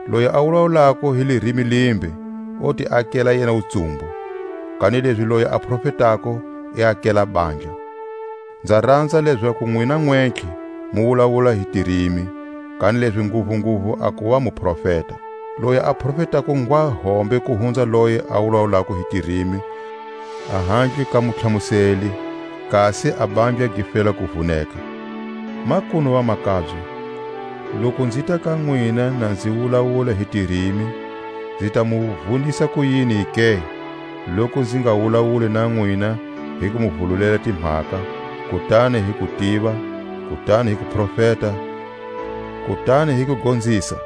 Loyi a wulawulako hi lirimi limbe o ti akela yena wutsumbu; kanilezi loyi a profetako i akela bandla. Nza ranza lezaku nwina nwentlhe mu wulawula hi tirimi, kanilezi nguvunguvu a kuva mu profeta. Loyi a profetako ngwa hombe ku hunza loye a wulawulako hi tirimi ahandle ka mutlhamuseli, kasi a bandla gi fela ku vuneka. Makunu vamakabye, loku nzita ka nwina na nzi wulawula hi tirimi, nzi ta mu vunisa kuyini ke, loku nzi nga wulawuli na nwina hi ku mu vululela timhaka, kutani hi kutiva, kutani hi kuprofeta, kutani hi kugonzisa?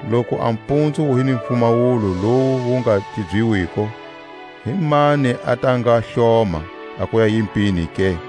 Loku a mpunzu wu hi ni pfumawulo lowu wu nga tibyiwiko, himani a ta nga hloma a kuya yimpini ke?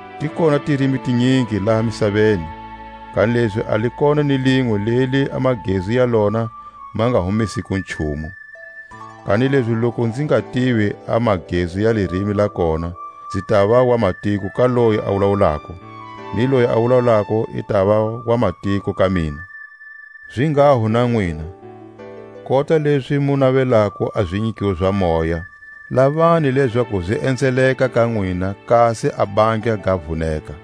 Ti kona tirimi tinyingi laha misaveni, kanilezi a li kona ni linwe leli a magezu ya lona ma nga humesiko nchumu. Kanilezi loku nzi nga tivi a magezu ya lirimi la kona, nzi tava wamatiko ka loyi a wulawulako, ni loyi a wulawulako i tava wamatiko ka mina. Zinghaho na nwina, kota lezi mu navelako a zinyikiwo za moya, lavani lezaku zi enzeleka ka nwina kasi a bandla ga vuneka.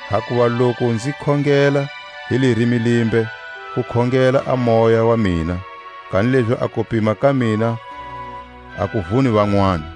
Hakuva loku nzi khongela hi lirimi limbe, ku khongela a moya wa mina, kanilezi a kupima ka mina a ku vuni vanwani.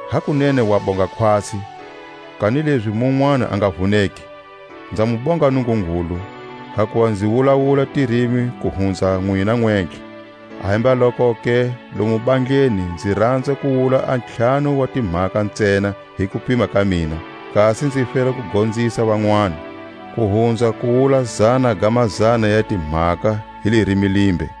Hakunene wa bonga khwatsi, kanilezi munwani a nga vuneki. Nza mu bonga Nungungulu, hakuva nzi wulawula tirimi ku hunza nwina nwentlhe. Ahembalokoke lomu bandleni nzi ranza ku wula a ntlhanu wa timhaka ntsena hi kupima ka mina, kasi nzi fela ku gonzisa vanwani, ku hunza ku wula zana ga mazana ya timhaka hi lirimi limbe.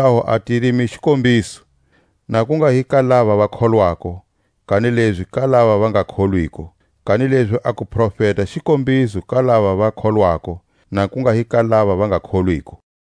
Hikwalaho a tirimi xikombiso, na ku nga hi ka lava va kholwako, kanilezi ka lava va nga kholwiko. Kanilezi a kuprofeta xikombiso ka lava va kholwako, na ku nga hi ka lava va nga kholwiko.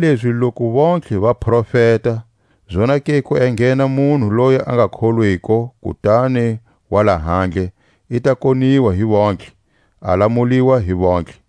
Kanilezi loku vontlhe va profeta, zonake ku enghena munhu loyi a nga kholwiko kutani wa lahandle, i ta koniwa hi vontlhe, a lamuliwa hi vontlhe.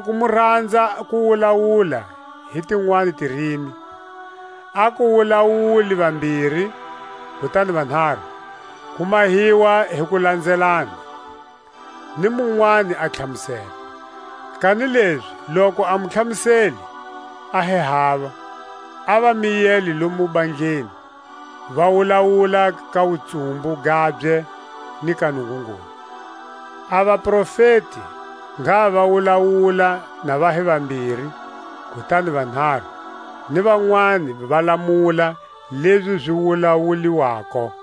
Loku mu ranza ku wulawula hi tinwani tirimi, a ku wulawule vambiri kutani vanharu; ku mahiwa hi ku lanzelana, ni munwani a tlhamusela. Kanilezi loku a mutlhamuseli a hi hava a va miyele lomu bandleni; va wulawula ka wutsumbu gabye ni ka Nungungulu. A vaprofeti ngha va wulawula na va hi vambiri kutani vanharu, ni vanwani va lamula lezi zi wulawuliwako.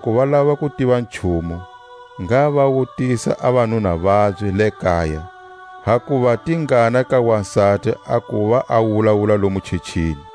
Loku va lava ku tiva nchumu, ngha va wutisa a vanuna vabye le kaya; hakuva tingana ka wasati a kuva a wulawula lomu chechini.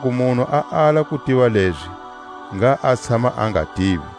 Loku munhu a ala ku tiva lezi, ngha a tshama a nga tivi.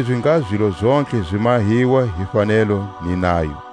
Kanilezi ngha zilo zontlhe zi mahiwa hi fanelo ni nayo.